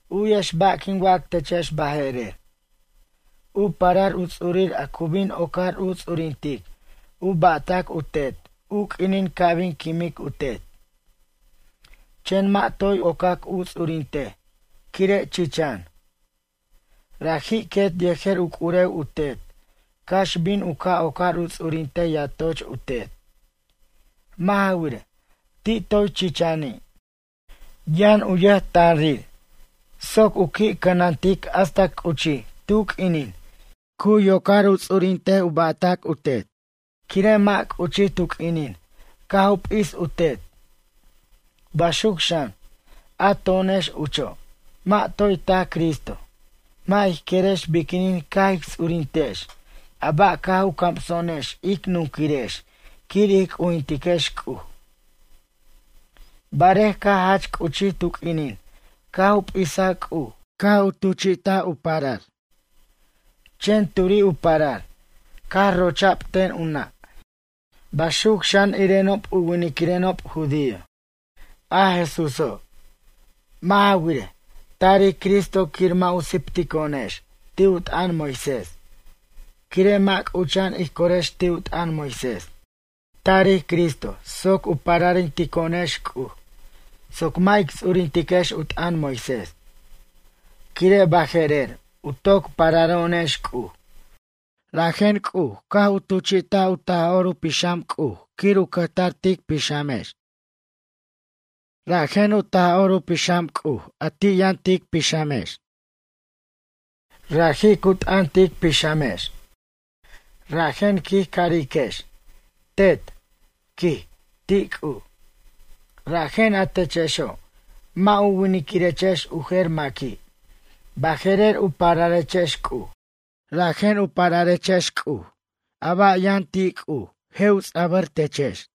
U'yex ba' quin wac techex baje'rer. U parar u ts'urir a cu bin ocar u ts'urintic u ba'tac u tet u q'uinin ca' bin quimic u tet. Chen mʌ' toy u ocac u ts'urintej quire' chichan. Raji' quet yejer u c'urew u tet cax bin u ca' ocar u ts'urintej yatoch u tet. Mʌ' ja wirej, ti' toy chichani', yʌn u yʌjtanrir soc u qui' cʌnantic hasta c'uchij tu q'uinin cu yocar u ts'urintej u ba'tac u tet. Quire' mʌ' c'uchij tu q'uinin caj u p'is u tet. Baxuc, xan, a to'onex ucho', mʌ' toy tac Cristo, mʌ' ij querex biquinin caj ic ts'urintex a ba' caj u camso'onex ic nunquirex quir ij c'ujintiquex C'uj. Barej caj jach c'uchij tu q'uinin caj u p'isa C'uj caj u tuchi't u parar. Chen turi' u parar, caj rocha'b ten u nʌ', baxuc xan irenob u winiquirenob judío, a Jesúso'. Mʌ' ja wirej, tarij Cristo quir mʌ' u siptico'onex ti' u t'ʌn Moisés quire' mʌ' c'ucha'an ij corex ti' u t'ʌn Moisés. Tarij Cristo soc u pararintico'onex C'uj, soc mʌ' ic ts'urintiquex u t'ʌn Moisés. Quire' baje'rer u toc pararo'onex C'uj, rajen C'uj caj u tuchi't u Taj'or u Pixam C'uj quir u cʌjtar tic pixamex. Rajen u Taj'or u Pixam C'uj a ti' yʌn tic pixamex, raji' cu t'ʌn tic pixamex. Rajen quij ca'ariquex: “Tet”, quij, ti' C'uj. Rajen a techexo', mʌ' u winquirechex u jer maqui', baje'rer u pararechex C'uj. Rajen u pararechex C'uj a ba' ti' yʌn C'uj, je' u ts'abʌr techex.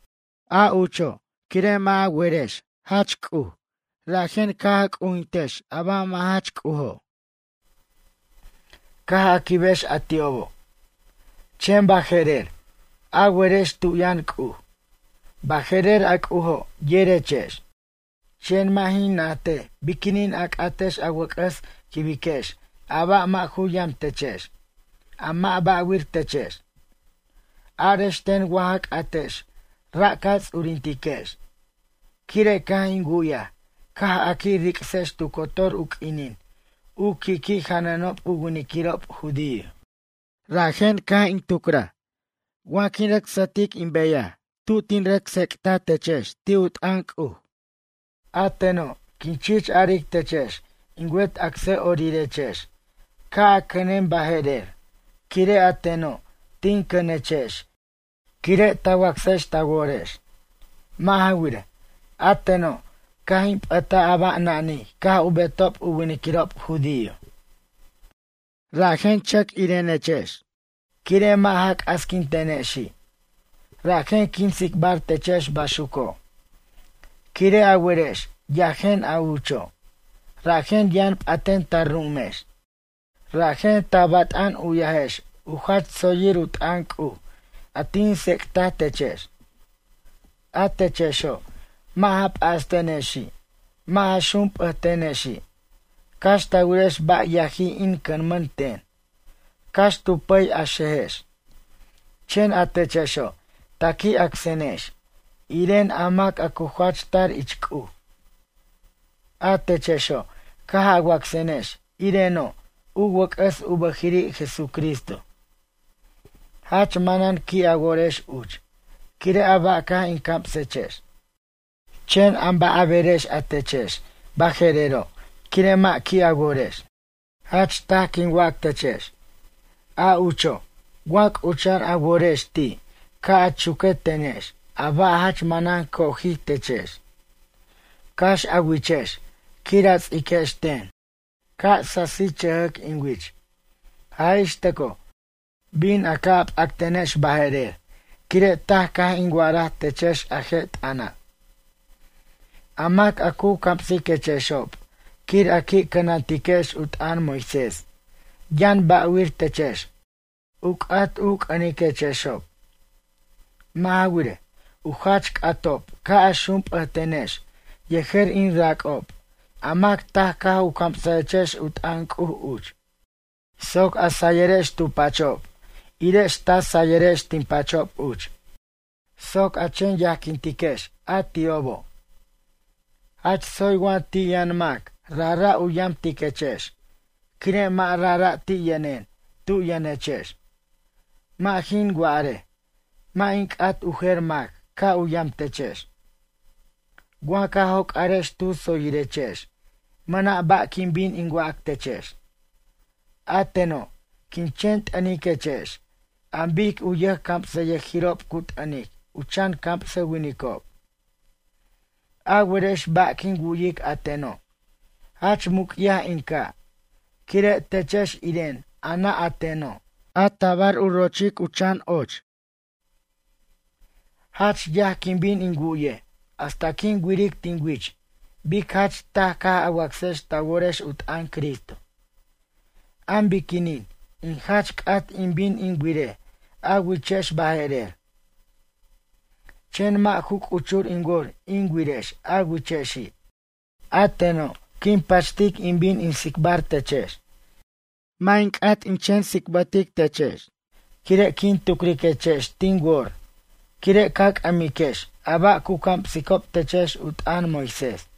A ucho', quire' mʌ' a werex jach C'uj rajen caj a c'ujintex a ba' mʌ' jach c'ujo', caj a quibex a ti'obo'. Chen baje'rer a werex tu yʌn C'uj, baje'rer a C'ujo' yerechex. Chen mʌ' jin najtej biquinin a c'atex a wʌc'ʌs quibiquex a ba' a mʌ' ju yamtechex, a mʌ' ba'wir techex. Arex ten wa ja c'atex ra' ca ts'urintiquex? Quire' caj in wu'yaj caj a qui' ric'sex tu cotor u q'uinin u qui'qui' janʌnob u winiquirob judío. Rajen caj in tucraj wa jin rʌc sʌtic in beyaj tu jin rʌc tsec'ta techex ti' u t'ʌn C'uj. A teno' quin chich aric techex in wet acsʌ'orirechex ca' a cʌnen baje'rer quire' a teno' tin cʌnechex quire' ta wacsex ta worex. Mʌ' ja wirej, a teno' caj in p'ʌtaj a ba' nanij caj u betob u winiquirob judío. Rajen chʌc irenechexex. Quire' mʌ' ja c'asquintenexi', rajen quin tsicbar techex baxuco'. Quire' a werex yajen a ucho', rajen yʌn p'aten ta ru'umex. Rajen ta bat'an u'yajex u jach tsoyir u t'ʌn C'uj a tin tsec'taj techex. A techexo' mʌ' ja p'astenexi' mʌ' ja xump'ʌtenexi' cax ta wirex ba' yajij in cʌnmʌn ten, cax tu pʌy a xejex. Chen a techexo' ta qui' acsenex, iren a mac a cu jach tar ich C'uj. A techexo', caj a wacsenex ireno' u wʌc'ʌs u bʌjiri' Jesucristo. Jach manan qui' a worex uch quire' a ba' caj in camsechex. Chen am ba' a berex a techex baje'rero' quire' mʌ' qui' a worex? Jach taj quin wac techex, a ucho' wa c'ucha'an a worex ti' ca' a chuque tenex a ba' jach manan cojij techex, cax a wichex quir a ts'iquex ten, ca' sasichʌjʌc in wich. Jaj ix tʌco, bin a ca' p'actenex baje'rer quire' taj caj in wa'araj techex a je' t'ʌna'. A mac a cu camsiquechexob quir a qui' cʌnantiquex u t'ʌn Moisés yʌn ba'wir techex, u c'at u c'ʌniquechexob. Mʌ' ja wirej, u jach c'atob ca' a xump'ʌtenex yejer in rac'ob, a mac taj caj u camsajechex u t'ʌn C'uj uch. Soc a sayirex tu pachob irex ta sayirex tin pachob uch. Soc a chen yajquintiquex a ti'obo'. Jach tsoy wa ti' yʌn mac rajra' u yamtiquechex quire' mʌ' rajra' ti' yʌnen tu yʌnechex. Mʌ' jin wa'are mʌ' in c'at u jer mac ca' u yam techex. Wa ca joc'arex tu tsoyirechex mʌna' ba' quin bin in wac techex. A teno' quin chen t'ʌniquechex an bic u yʌjcamsʌyʌjirob cu t'ʌnic u chan camsʌwinicob. A werex ba' quin wu'yic a teno'? Jach muc'yaj in ca' quire' techex iren a nʌ' a teno' a tabar u rochic u chan ochir. Jach yaj quin bin in wu'ye hasta quin wiric tin wich bic jach taj caj a wacsex ta worex u t'ʌn Cristo. Am biquinin in jach c'at in bin in wirej a wichex baje'rer, chen mʌ' ju c'uchur in wor in wirex a wichexi'. A teno', quin pachtic in bin in tsicbar techex. Mʌ' in c'at in chen ts'ibtic techex quire' quin tucriquechex tin wor quire' ca c'ʌmiquex a ba' cu camsicob techex u t'ʌn Moisés.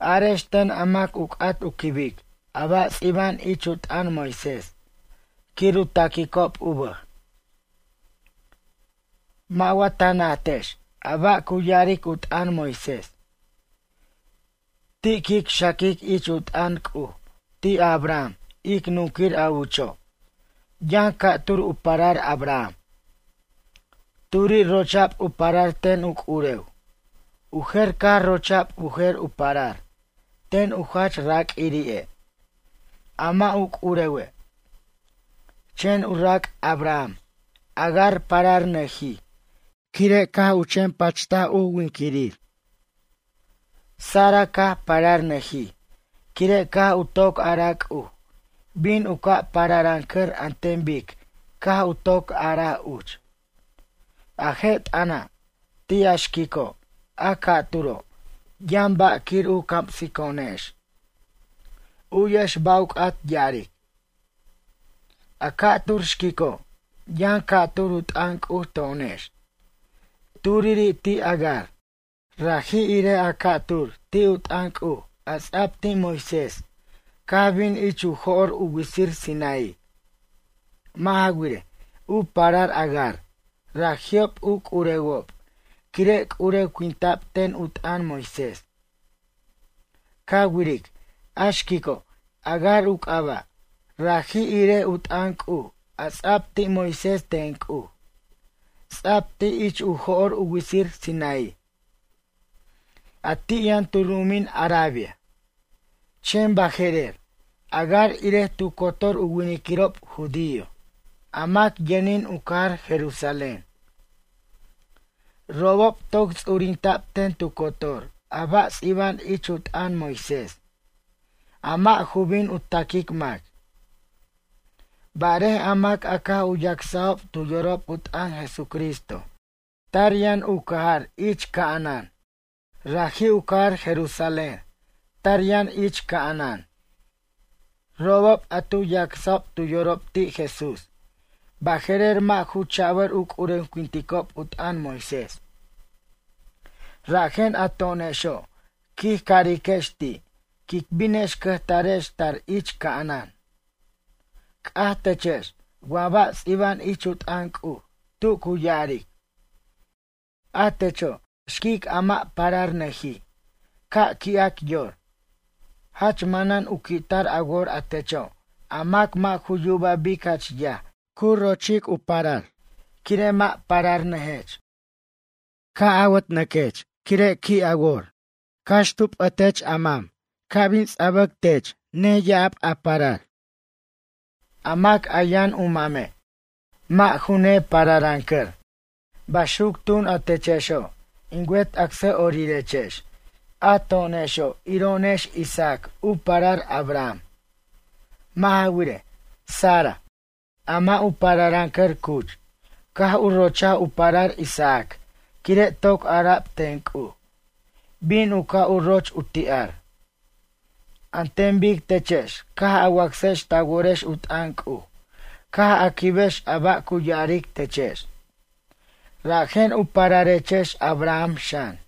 Arex ten a mac u c'at u quibic a ba' ts'iba'an ich u t'ʌn Moisés quir u taquicob u bʌj. Mʌ' wa ta najtex a ba' cu ya'aric u t'ʌn Moisés? Ti' quic xaquic ich u t'ʌn C'uj ti' a Abraham ic nunquir a ucho' yʌn ca'tur u parar Abraham. Turi' rocha'b u parar ten u c'urew, u jer caj rocha'b u jer u parar ten u jach raq'uirire' a mʌ' u c'urewe'. Chen u rac' Abraham Agar pararnʌjij quire' caj u chen pacht u winquirir. Sara caj pararnʌjij quire' caj u toc araj C'uj bin u ca' pararʌncʌr an ten bic caj u toc a'araj uch. A je' t'ʌna' ti' a xquico', a ca'turo', yʌn ba' quir u camsico'onex. U'yex ba' u c'at ya'aric: A ca'tur xquico', yʌn ca'tur u t'ʌn C'uj to'onex. Turiri' ti' Agar, raji' irej a cu tar ti' u t'ʌn C'uj a ts'a'b ti' Moisés caj bin ich u jo'r u witsir Sinaí. Mʌ' ja wirej, u parar Agar raji'ob u c'urewob quire' c'urewinta'b ten u t'ʌn Moisés. Ca wiric, a xquico', Agar u c'aba', raji' irej u t'ʌn C'uj a ts'a'b ti' Moisés ten C'uj. Ts'a'b ti' ich u jo'r u witsir Sinaí, a ti' yʌn tu ru'umin Arabia. Chen baje'rer Agar irej tu cotor u winiquirob judío a mac yʌnin u cajar Jerusalén. Robob toc ts'urinta'b ten tu cotor a ba' ts'iba'an ich u t'ʌn Moisés, a mʌ' ju bin u taquic mac. Barej a mac a caj u yacsajob tu yorob u t'ʌn Jesucristo tar yʌn u cajar ich ca'anan. Raji' u cajar Jerusalén tar yʌn ich ca'anan. Robob a tu yacsob tu yorob ti' Jesús baje'rer mʌ' ju chabʌr u c'urewinticob u t'ʌn Moisés. Rajen a to'onexo' quij cariquex ti' quic binex cʌjtarex tar ich ca'anan. C'aj techex wa ba' ts'iba'an ich u t'ʌn C'uj tu cu ya'aric: A techo', a xiquic a mʌ' pararnʌjij, ca' qui'ac yor. Jach manan u qui'tar a wor a techo' a mac mʌ' ju yuba bic jach yaj ca' a rocha'b a parar, quire' mʌ' pararnʌjech. Caj awʌtnʌquech quire' qui' a wor, cax tu p'ʌtech a mam ca' bin ts'abac tech neya'ab a parar. A mac a yʌn u mame', mʌ' ju nepararʌncar. Baxuc tun a techexo', in wet acsʌ'orirechex. A to'onexo' iro'onex Isaac u parar Abraham. Mʌ' ja wirej, Sara, a mʌ' u pararʌncar cuch, caj u rochaj u parar Isaac quire' toc ara'b ten C'uj: “Bin u ca' u roch u ti'ar.” An ten bic techex caj a wacsex ta worex u t'ʌn C'uj, caj a quibex a ba' cu ya'aric techex. Rajen u pararechex Abraham xan.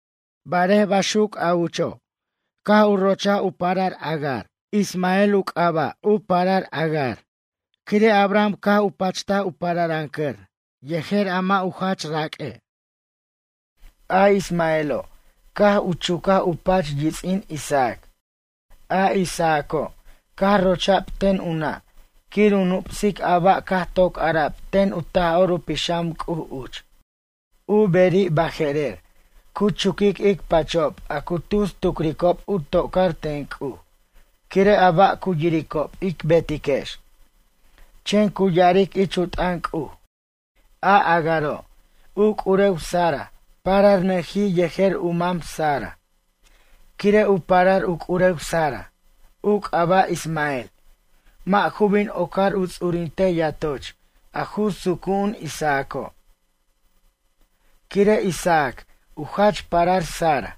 Barej baxuc a ucho', caj rocha'b ten Agar Ismael, u c'aba' u parar Agar quire' Abraham caj u pacht u pararʌncʌr yejer mʌ' u jach raq'ue'. A Ismaelo' caj u chucaj u pach yits'in Isaac. A Isaaco' caj rocha'b ten u nʌ' quir u nup'sic a ba' caj toc ara'b ten u Taj'or u Pixam C'uj uch. U beri' baje'rer cu chuquic ic pachob a cu tus tucricob u tocar ten C'uj quire' a ba' cu yiricob ic betiquex. Chen cu ya'aric ich u t'ʌn C'uj: “A Agaro' u c'urew Sara pararnʌjij yejer u mam Sara, quire' u parar u c'urew Sara, u c'aba' Ismael mʌ' ju bin ocar u ts'urintej yatoch a ju sucu'un Isaaco'. Quire' Isaac u jach parar Sara.”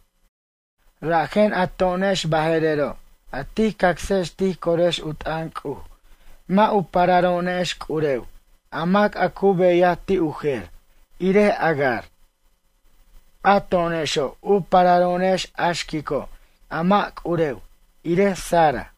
Rajen a to'onex baje'rero' a tij cacsex tij corex u t'ʌn C'uj mʌ' u pararo'onex c'urew a mac a cu beyaj ti' u jer, irej Agar. A to'onexo' u pararo'onex a xquico' a mʌ' c'urew, irej Sara.